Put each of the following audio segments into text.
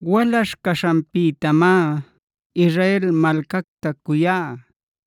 “Walaśh caśhanpïtamá Israel malcacta cuyá.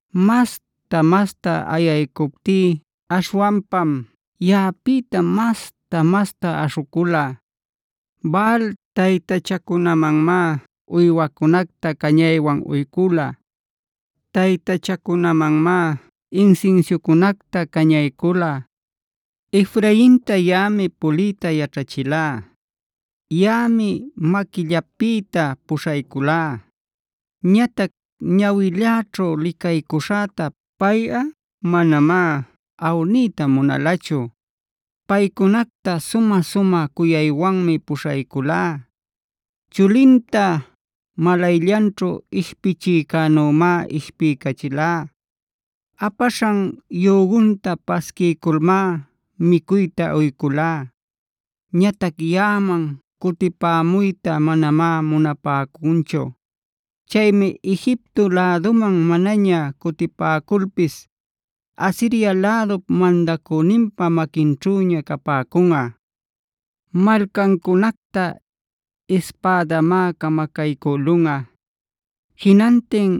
Masta-masta ayaycuptí aśhwanpam yaꞌapïta masta-masta aśhucula. Baal taytachacunamanmá uywacunacta cañaywan uycula; taytachacunämanmá insinsiucunacta cañaycula. “Efrainta yaꞌami puliyta yaćhachilá; yaꞌami maquillapïta puśhayculá. Ñatac ñawilläćhu licaycuśhäta payꞌa manamá awniyta munalachu. Paycunacta sumä cuyaywanmi puśhayculá. Chulinta malayllanćhu ishpichïcänümá ishpiycachilá. Apaśhan yügunta pasquiyculmá micuyta uyculá. “Ñatac yaꞌaman cutipämuytá manamá munapäcunchu. Chaymi Egipto läduman manaña cutipäculpis, Asiria lädup mandacüninpa maquinćhüña capäcunꞌa. Malcancunacta ispädamá camacaycülunꞌa. Jinantin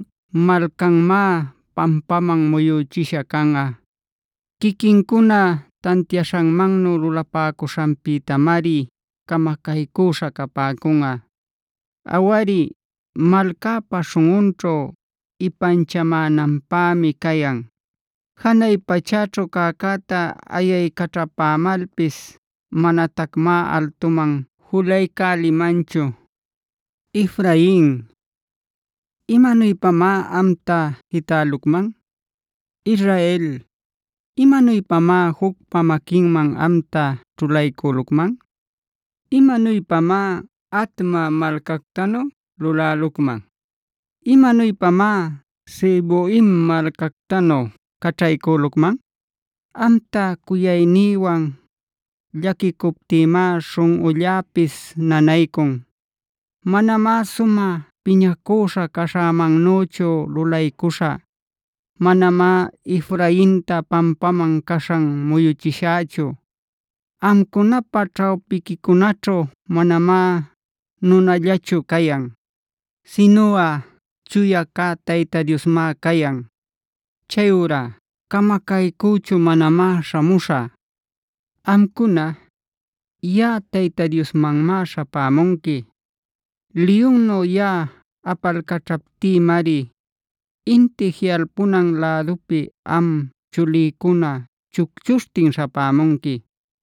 malcanmá pampaman muyüchisha canꞌa. Quiquincuna tantiaśhanmannu lulapäcuśhanpïtamari camacaycüśha capäcunꞌa. Awari, malcäpä śhunꞌunćhu ipanchamänanpämi cayan. Janay pachäćhu cäcäta ayaycaćhapämalpis manatacmá altuman julaycälimanchu. “Efrain, ¿imanuypamá amta jitälucman? Israel, ¿imanuypamá jucpa maquinman amta ćhulaycülucman?b ¿Imanuypamá Adma malcactanu lulälucman? ¿Imanuypamá Zeboimc malcactanu caćhaycülucman? Amta cuyaynïwan llaquicuptïmá śhunꞌulläpis nanaycun. Manamá sumä piñacüśha caśhämannüchu lulaycuśhä. Manamá Efrainta pampaman caśhan muyuchishächu. Amcunapa ćhawpiquicunaćhu manamá nunallachu cayan, sinuꞌa Chuya cä Tayta Diosmá cayan. Chayurá camacaycüchu manamá śhamuśhä. “Amcuna, yaꞌa Tayta Diosmanmá śhapämunqui. Liyunnu yaꞌa apalcaćhaptïmari inti jiꞌalpunan lädupi am chulïcuna chucchuśhtin śhapämunqui.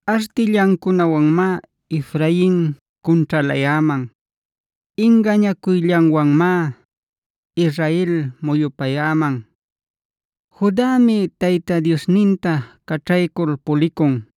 “Artillancunawanmá Efrain cunćhalayäman. Ingañacuyllanwanmá Israel muyupayäman. Judami Tayta Diosninta caćhaycul pulicun.